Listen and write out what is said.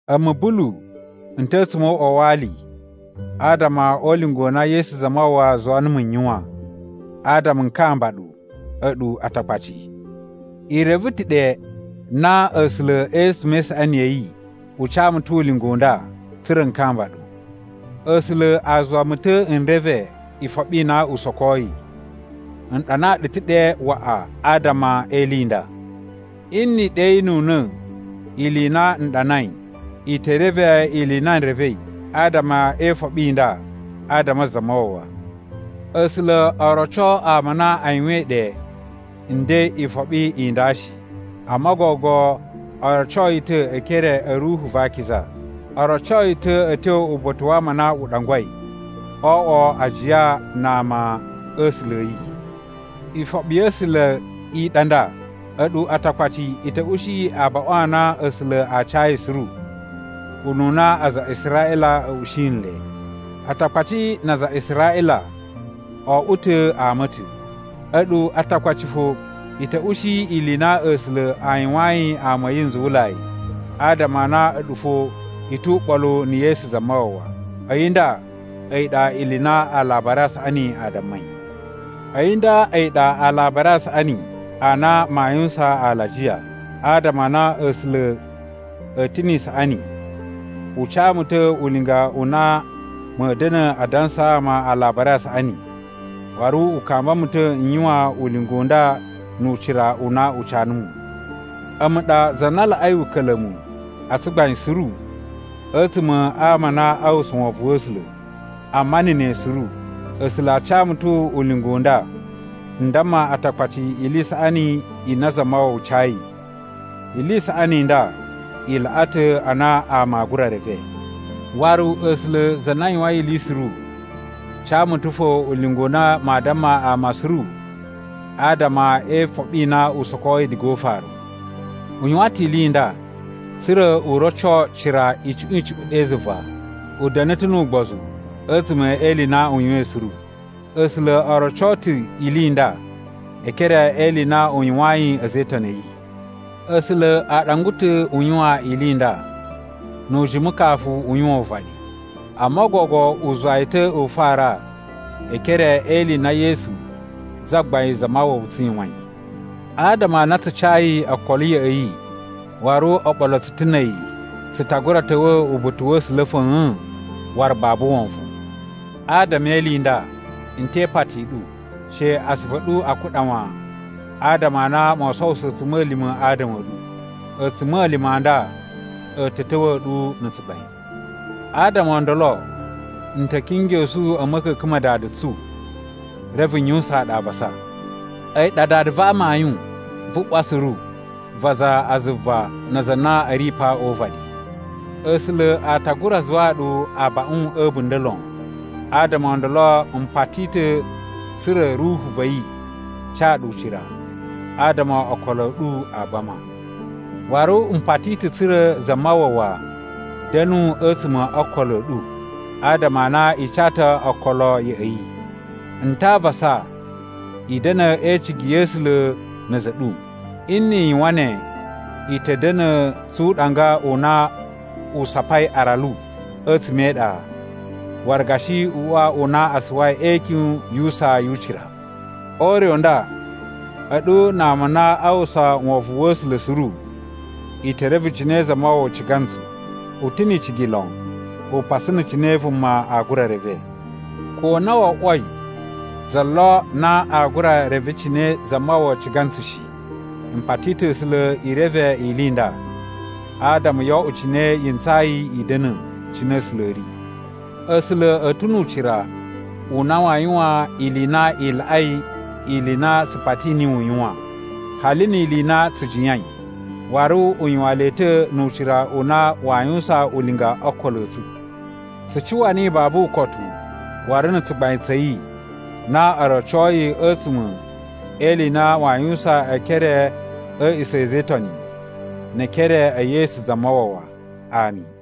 A̱mu, Bulu n ta̱ a̱tsuma̱ o uꞌwa wa ali adama o ulinga u na Yesu Zamawawa zuwa numu n yuwan, adama n kamba ɗu, a̱ɗu Atakpaci. I reve ta̱ ɗe na A̱sula̱ a̱tsuma̱ e isaꞌani ya̱ yi u ca mu ta̱ ulinga u nda tsa̱ra̱ n kamba ɗu. A̱sula̱ a zuwa mu ta̱ n reve ifoɓi i na u sokoi. N ɗanaa ɗu ta̱ ɗe waꞌa adama e ili i nda. Nni i ɗeyinuna̱ ili i na n ɗanai, i te reve ili i na n revei adama e ifoɓi i nda adama a Zamawawa. A̱sula̱ o roco ama a na a yuwain ɗe nden ifoɓi i nda shi. Amma gogo o roco yi ta̱ e ekere a̱ Ruhu va Akiza. O roco yi ta̱ a̱ tyo uba̱ta̱ wa ama a na u ɗangwai o oꞌwo ajiya na ama a̱ A̱sula̱ a̱ yi. Ifoɓi ya̱ A̱sula̱ i ɗa nda: a̱ɗu Atakpaci i ta̱ ushi abaꞌun a na A̱sula̱ a cayi suru, ununa aza a Israꞌila a̱ ushi nle. Atakpaci na aza a Israꞌila o oꞌwo ta̱ ama a̱ ta̱. A̱ɗu Atakpaci fo i ta̱ ushi ili i na A̱sula̱ a yuwayin ama a̱ yi nzuwulai adama a na a̱ɗu fo i tu uɓolu na̱ Yesu Zamawawa. A̱yi nda a̱yi ɗa ili i na Alabari a Saꞌani a dammai. A̱yi nda a̱yi ɗa Alabari a Saꞌani a na maa yuwusan alajiya. Adama a na A̱sula̱ a̱ ta̱ ni isaꞌani, u ca mu ta̱ ulinga u na ma̱a̱ da̱na̱ a dansaa ama Alabari a Saꞌani, waru u kamba mu ta̱ n yuwan ulinga u nda nu ucira u na u ca numu. A̱mu ɗa za na laꞌai uka̱la̱mu a tsugbain suru a̱tsuma̱ a ama a na a uwwusa wovon wa̱ A̱sula̱, amma na̱ ne suru, A̱sula̱ a ca mu ta̱ ulinga u nda n damma Atakpaci ili i saꞌani i na Zamawawa cayi. Ili i saꞌani i nda i laꞌa ta̱ a na ama aa gura reve. Waru A̱sula̱, za na yuwain ili suru, ca mu ta̱ fo ulinga u na maa damma ama suru adama e ifoɓi i na u sokoi diga o ufaru. U yuwan ta̱ ili i nda, tsa̱ra̱ u roco cira icuꞌun icuꞌun ɗe zuva, u da̱na̱ ta̱ nu ugbozu a̱tsuma̱ e ili i na u yuwain suru. A̱sula̱ o roco ta̱ ili i nda e ekere e ili i na u yuwayin a̱za̱ e Itoni a̱ yi. A̱sula̱ a ɗangwa ta̱ u yuwan ili i nda, nu ujimu kafu u yuwan uvaɗi, amma gogo u zuwa yi ta̱ u fara e ekere e ili i na Yesu Zagbain Zamawawa tsu yuwain. Adama a na tsu cayi okolo ya̱ꞌa̱ yi waru o ɓolo tsu ta̱ na̱ a̱yi, tsu ta gura ta̱wa̱ uba̱ta̱ wa̱ A̱sula̱ fa̱a̱n waru babu wovon. Adama e ili i nda, n te ipati i ɗu, she asuvu a̱ ɗu a kuɗa wan adama a na moo sowuso a̱tsuma̱lima̱ adama a̱ ɗu. A̱tsuma̱lima̱ a nda a̱ ta̱ ta̱wa̱a̱ ɗu na̱ tsugbain. Adama o ndolo, n ta̱ kingyosu a̱ ma̱ka̱ka̱n ma Dada tsu, reve n yuwusaan ɗu avasa. A̱yi ɗa Dada va amayun vu ꞌwa suru, va aza a zuva na aza a na a̱ ri pa o uvaɗi. A̱sula̱ a ta gura zuwaa ɗu abaꞌun a̱ a̱bunda̱ lon. Adama o ndolo m pati ta̱ tsa̱ra̱ Ruhu va̱ yi ca ɗu ucira, adama okolo a̱ ɗu a gbama. Waru m pati ta̱ tsa̱ra̱ Zamawawa da̱nu a̱tsuma̱ o okolo a̱ ɗu adama a na i ca ta̱ okolo ya̱ꞌa̱ yi. N ta a avasa i da̱na̱ e icigi ya̱ A̱sula̱ na̱ a̱za̱ a̱ ɗu. Nni i yuwan ne, i ta̱ da̱na̱ tsu uɗanga u na u sapai aralu a̱tsuma̱ e iɗa, waru gashi uꞌwa u na a suwai e ikyun yu usaa yu ucira. O ure u nda, a̱ɗu na ama a na a uwwusa wovon wa̱ A̱sula̱ suru, i te reve cine Zamawawa ciga ntsu. U ta̱ ni icigi lon, upasu na̱ cine vuma aa gura reve. Ko na wo oꞌwoi za lo na aa gura reve cine Zamawawa ciga ntsu shi, m pati ta̱ A̱sula̱ i reve ili i nda, adama yoo oꞌwo cine yi ntsayi i da̱na̱, cine A̱sula̱ a̱ ri. A̱sula̱ a̱ ta̱ nu ucira u na waa yuwan ili i na i laꞌai ili i na tsu pati niyi u yuwan, hali ni ili i na tsu jiyain. Waru u yuwan le ta̱ nu ucira u na waa yuwusan ulinga o okolo a̱ tsu. Tsu cuwa niyi babu ukotu waru na̱ tsugbain tsa̱ yi na o rocoi a̱tsuma̱ e ili i na waa yuwusan e ekere a̱ a̱a̱ꞌisa̱ a̱ a̱za̱ e Itoni ne e ekere e Yesu Zamawawa! Ami.